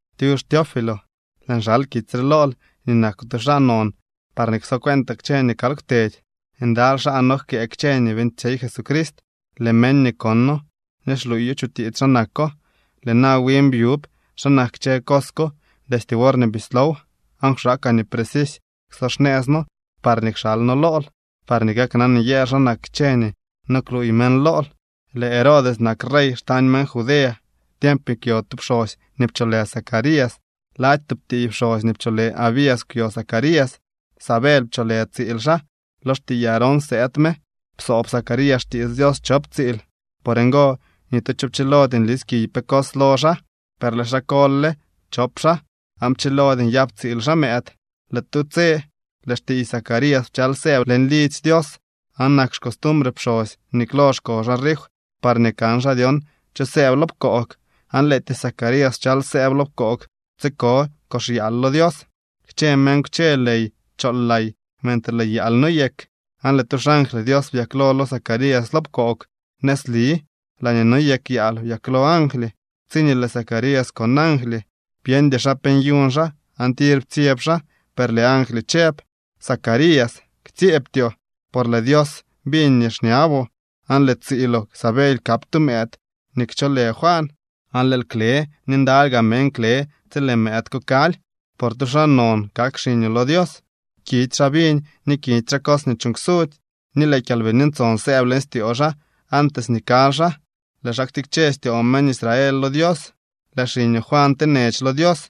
Tyux Teófilo. Lëën xal kitsy re lool nii nakoo tu xaa non parñee ksocueentaa kchë nii kal kwtedy. Ndaly xaa nojkëë kchë nii beeñtsyey Jesucrist. Lëë meñ nii kono ni xluuyo chutiits xa nako. Lëë na win byub xa nak kchë cos ko destye worñee bislow, aan kwxaakaa nii precisy kso xnëëz noo parñee kxalno lool parñee kaknan nyëël xa nak kchë nii no kluuy meñ lool. Lëë Herodes nak rey xtañ meñ Judea tiemp nii kwyo tu pxosy nii pcholë Zacarías. Lady tub tiiy pxosy nii pcholë Abías kwyo Zacarías. Sabely pcholë tsiil xaa, lo xtiiy Aarón sëëd me. Psoob Zacarías xtiits Dios chop tsiil. Por ngo ni tu cho pchilody nlis kiy pe cos lo xaa. Per lëë xaa kol le chop xaa aan pchilody nyap tsiil xaa mëëd. Lëë tu tse lëë xtiiy Zacarías pchal sëëb leñ lidzy Dios, aan nak xcostumbre pxosy nii klo xko xaa rif parñee kan xaa dyon cho sëëb lo pkoog, aan lëëtyee Zacarías pchal sëëb lo pkoog tsiko kox yaal lo Dios. Kchë meñ kwche ley chool lay mentre lëë yaal noyek. Aan lëë tu xangly Dios byaklo lo Zacarías lo pkoog. Nëzli laañee noyek yaal byaklo angly. Tsiñee lëë Zacarías kon angly, byeñdy xaa pe nyuñ xaa aan tir ptsyeb xaa. Per lëë angly chëb: —Zacarías, ktsyeebtyoo, por lëë Dios biñ nii xñaboo, aan lëë tsiiloo Sabely kap tu mëëd nii kcholë Juan. Aan lëël kle ni ndaly gaa meñ kle tsi lëë mëëd ko kaly. Por tu xaa non kak xiñoo lo Dios. Kidy xaa viñ ni kidy xaa cos nii chuuñ ksudzy, ni lëë Kyalbini Ntson sëëb leñ styoo xaa antes nii kaly xaa. Lëë xaa ktikche styoo meñ Israel lo Dios. Lëë xiñoo Juan tenech lo Dios,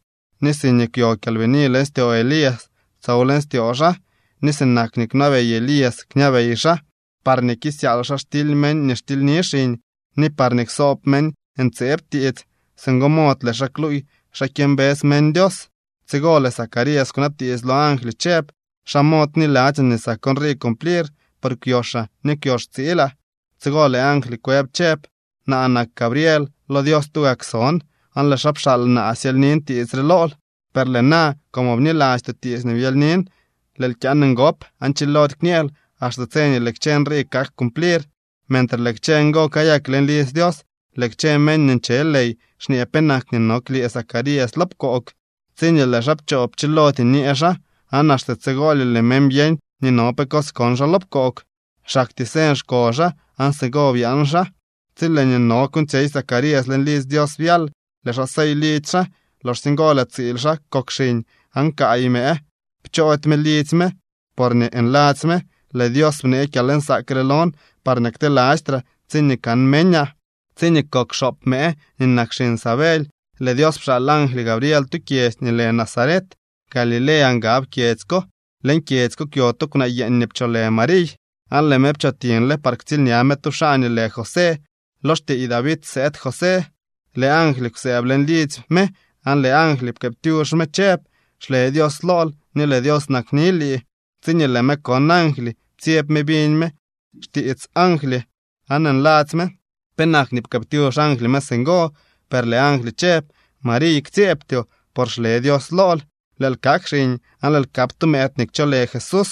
ni siñee kwyo kyalbini leñ styoo Elías, tsow leñ styoo xaa, ni sinak nii kwnabey Elías kñabey xaa, parñee kisyaal xaa xtily meñ nii xtilyni xiñ, ni parñee ksoob meñ ntseeb tiits. Singo mod lëë xaa kluuy xa kyëmbës meñ Dios. Tsigo lëë Zacarías kwnabtiits lo angly chëb: —¿Xa mod kniladzyaa nii sak nrii cumplir? Por kwyoxaa ni kwyox tsiilaa. Tsigo lëë angly kwëb chëb: —Naa nak Gabriel. Lo Dios tugak son, aan lëë xaa pxaal naa syelynin tiits re lool. Per lëë na como bnilastyoo tiits nii byelynin, lëël kyaan ngop, aan chilody kñeel axte tse lëë kchë nrii kak cumplir. Mentre lëë kchë ngo kayak leñ lidzy Dios, lëë kchë meñ nii nche ley xñee penak nii no klyëë Zacarías lo pkoog. Tsiñee lëë xaa pchoo, pchilody nyee xaa, aan axte tsigolye lëë meñ byeñ nii no pe cos kon xaa lo pkoog, xaktyee señ xko xaa aan singo byaan xaa. Tsi lëë nii no kuuñtsyey Zacarías leñ lidzy Dios byal, lëë xaa sey lidzy xaa. Loxsye ngo lëë tsiil xaa kok xiñ, aan kaay mëë pchoody me lidzy me porñee nladzy me: “Lëë Dios bnee kyalnsaak re lon parñee ktelastraa tsiñee kan meñaa.” Tsiñee kok xoop mëë nii nak xiñ Sabely, lëë Dios pxaal angly Gabriel tu kyedzy nii lë Nazaret. Galilea ngab kyedzy ko. Leñ kyedzy ko kwyo tu kwnaa yeeñ nii pcholë Mariy, aan lëë me pchootiñle par ktsiilña me tu xaa nii lë José. Lo xtiiy David sëëd José. Lëë angly kwsëëb leñ lidzy me aan lëë angly pkëëptyux me chëb: —¡Xle Dios lool ni lëë Dios nakni lii! Tsiñee lëë me kon angly, ptsyeb me biñ me xtiits angly, aan nladzy me penak nii pkëëptyux angly me singo. Per lëë angly chëb: —Mariy, ktsyeebtyoo, por xle Dios lool. Lëël kak xiñ aan lëël kap tu mëëd nii kcholë Jesús.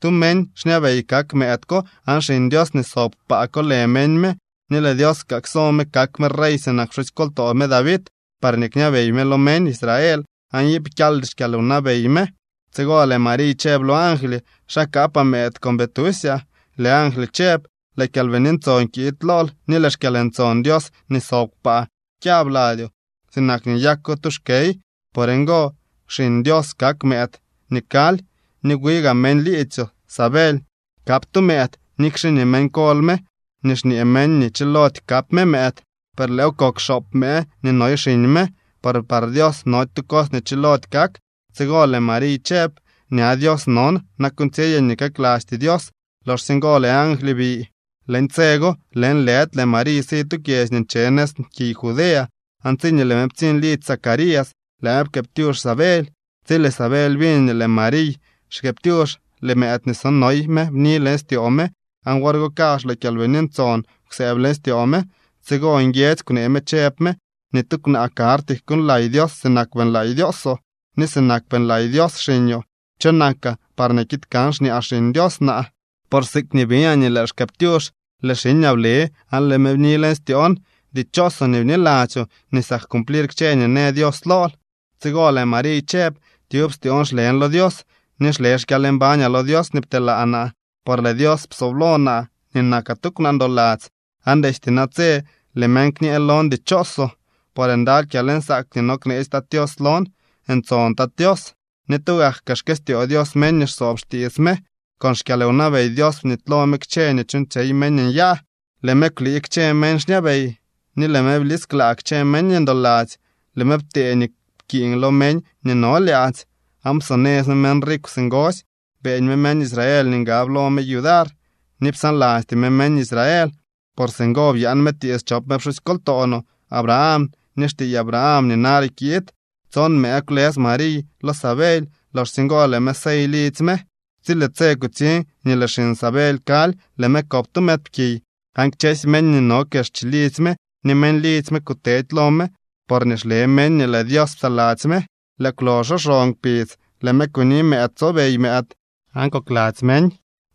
Tu meñ xñabey kak mëëd ko aan Xiñ Dios nii sob kpaa kolë meñ me, ni lëë Dios kaa kso me kak me rey sinak pxusykoltoo me David, parñee kñabey me lo meñ Israel aan iip kyaldy xkyalwnabey me. Tsigo lëë Mariy chëb lo angly: —¿Xa kaapaa mëëd con bii tusyaa? Lëë angly chëb: —Lëë Kyalbini Ntson kiid lool, ni lëë xkyalntson Dios nii sob kpaa kyab ladyoo sinak nii nyako tu xkey. Por ngo Xiñ Dios kak mëëd nii kaly. Ni wi gaa meñ liidzyoo Sabely kap tu mëëd, nikxe nii meñ kol me ni xñee meñ nii chilody kap mëëd. Per lëëw kok xoop mëë nii noy xiñ me, por par Dios nody tu cos nii kchilody kak. Tsigo lëë Mariy chëb: —Ña Dios non. Na kuuñtsyeyaa nii kaklastyee Dios. Loxsye ngo lëë angly bi. Leñ tse go lëënlëdy lëë Mariy si tu kyedzy nii nche nëz kiy Judea. Aan tsiñee lëë me ptsiñ lidzy Zacarías, lëë me pkëëptyux Sabely. Tsi lëë Sabely biñ nii lëë Mariy xkëëptyux, lëë mëëd nii so noy me bni leñ styoo me, aan wor go kazh lëë Kyalbini Ntson kwsëëb leñ styoo me. Tsigo nguiedzy kwnee me chëb me: —Ni tu kwnaa karty kuuñlay Dios sinak beeñlay Dioosoo, ni sinak beeñlay Dios xiñoo. ¿Cho nakaa parñee kiid kan xñaa Xiñ Dios naa? Por siikñee biñaa nii lëël xkëëptyux, lëë xiñaa ble aan lëë me bni leñ styoon. Dichoosoo nii bniladzyoo nii sak cumplir kchë nii në Dios lool. Tsigo lëë Mariy chëb: Tyub styoon xlen lo Dios. Ni xle xkyalmbañaa lo Dios nii pteelaa naa. Por lëë Dios psooblo naa nii nakaa tu kwnaa ndoladzy, aan destye natse lëë meñ kñë lon dichoosoo. Por ndaly kyalnsaak nii no kneetsy Tat Tios lon. Ntson Tat Tios. Ni tugak kaa xkëstyoo Dios meñ nii xsoob xtiits me. Con xkyalwnabey Dios bnitylo me kchë nii nyuuñtsyey meñ nyaa. Lëë me kwlii kchë meñ xñabey, ni lëë me blisklaa kchë meñ ndoladzy. Lëë me ptee nii pkiiñ lo meñ nii no lyaadzy, aan psonëz me meñ rikw singosy. Beeñ me meñ Israel nii ngab lo me yudar, ni psaanlasty me meñ Israel. Por singo byaan me tiits chop me pxusykoltoo no Abraham ni xtiiy Abraham nii nare kiid. Tson mëë kwlës Mariy lo Sabely. Loxsye ngo lëë me sey lidzy me. Tsi lëë tse kutsiñ nii lëë xiñ Sabely kaly, lëë me kop tu mëëdpkiy. Aan kchësy meñ nii no kex chilidzy me ni meñ lidzy me kutedy lo me porñee xle meñ nii lëë Dios psaladzy me. Lëë kwloxo xon kpidz, lëë me kuni mëëd tsobey mëëd, aan kokladzy meñ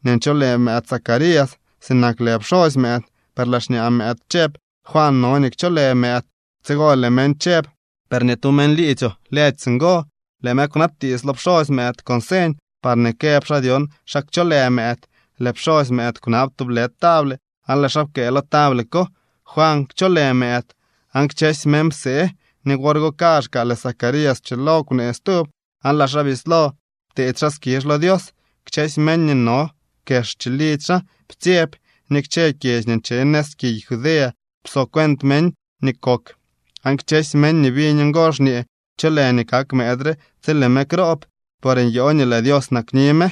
nii ncholë mëëd Zacarías sinak lë pxosy mëëd. Per lëë xñaa mëëd chëb: —Juan no nii kcholë mëëd. Tsigo lëë meñ chëb: —Per ni tu meñ liidzyoo lëdy singo. Lëë meñ kwnabtiits lo pxosy mëëd con señ, parñee këb xaa dyon xa kcholë mëëd. Lëë pxosy mëëd kwnab tublë table aan lëë xaa pkëë lo table ko: “Juan kcholë mëëd.” Aan kchësy meñ psee. Ni wor go kaazhkaa lëë Zacarías pchilo kwnee stub, aan lëë xaa bislo pteedy xaa skizh lo Dios. Kchësy meñ nii no kex chilidzy xaa ptsyeb, ni kchë kyedzy nii nche nëz kiy Judea pso cuent meñ nii kok. Aan kchësy meñ nii biñ ngo xñee: —¿Cho lë nii kak mëëd re tsi lëë me kroob? Por nyoo nii lëë Dios nakni me.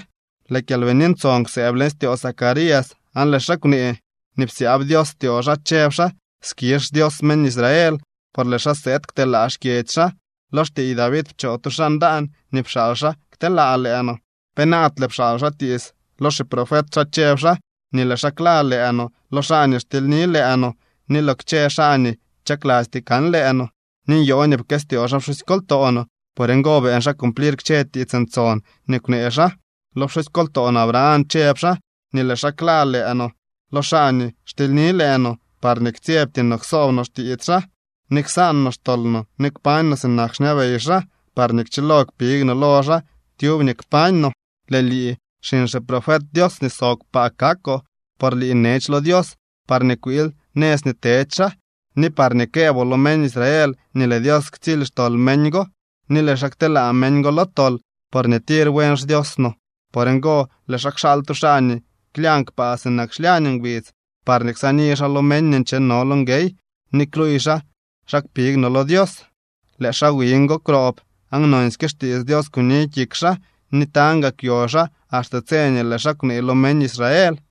Lëë Kyalbini Ntson kwsëëb leñ styoo Zacarías aan lëë xaa kwnee nii psyaab Dios styoo xaa, chëb xaa: Skizh xDios meñ Israel, por lëë xaa sëëd kteelaa xkyedzy xaa. Lo xtiiy David pchoo tu xaa ndaan nii pxaal xaa kteelaa lëë no. Penaadle pxaal xaa tiits lo xiprofet xaa chëb xaa nii lëë xaa kla lëë no lo xaa nii xtilyni lëë no ni lo kchë xaa nii chaklasty kan lëë no. Ni nyoo nii pkëstyoo xaa pxusykoltoo no. Por ngo beeñ xaa cumplir kchë tiits ntson nii kwnee xaa. Lo pxusykoltoo no Abraham chëb xaa nii lëë xaa kla lëë no lo xaa nii xtilyni lëë no, parñee ktsyebty no ksoob no xtiits xaa, ni ksaan no xtol no ni kpañ no sinak xñabey xaa parñee kchilo kpig no lo xaa tyub nii kpañ no. Lëë lii, xiñ xiprofet Dios nii sob kpaa kakoo, por lii nech lo Dios parñee kwiil nëz nii tedy xaa, ni parñee këëboo lo meñ Israel nii lëë Dios ktsily xtol meñ go, ni lëë xaa kteelaa meñ go lo tol. Porñee tir buen xDios no, por ngo lëë xaa kxaal tu xaa nii klyañ kpaa sinak xlyañ ngbidz, parñee ksaani xaa lo meñ nii ncheno lo nguey, ni kluuy xaa xa kpig no lo Dios. Lëë xaa wiñ go kwroob aan nonsyke xtiits Dios kuni kik xaa, ni tañ gaa kwyo xaa axte tse nii lëë xaa kwnee lo meñ Israel.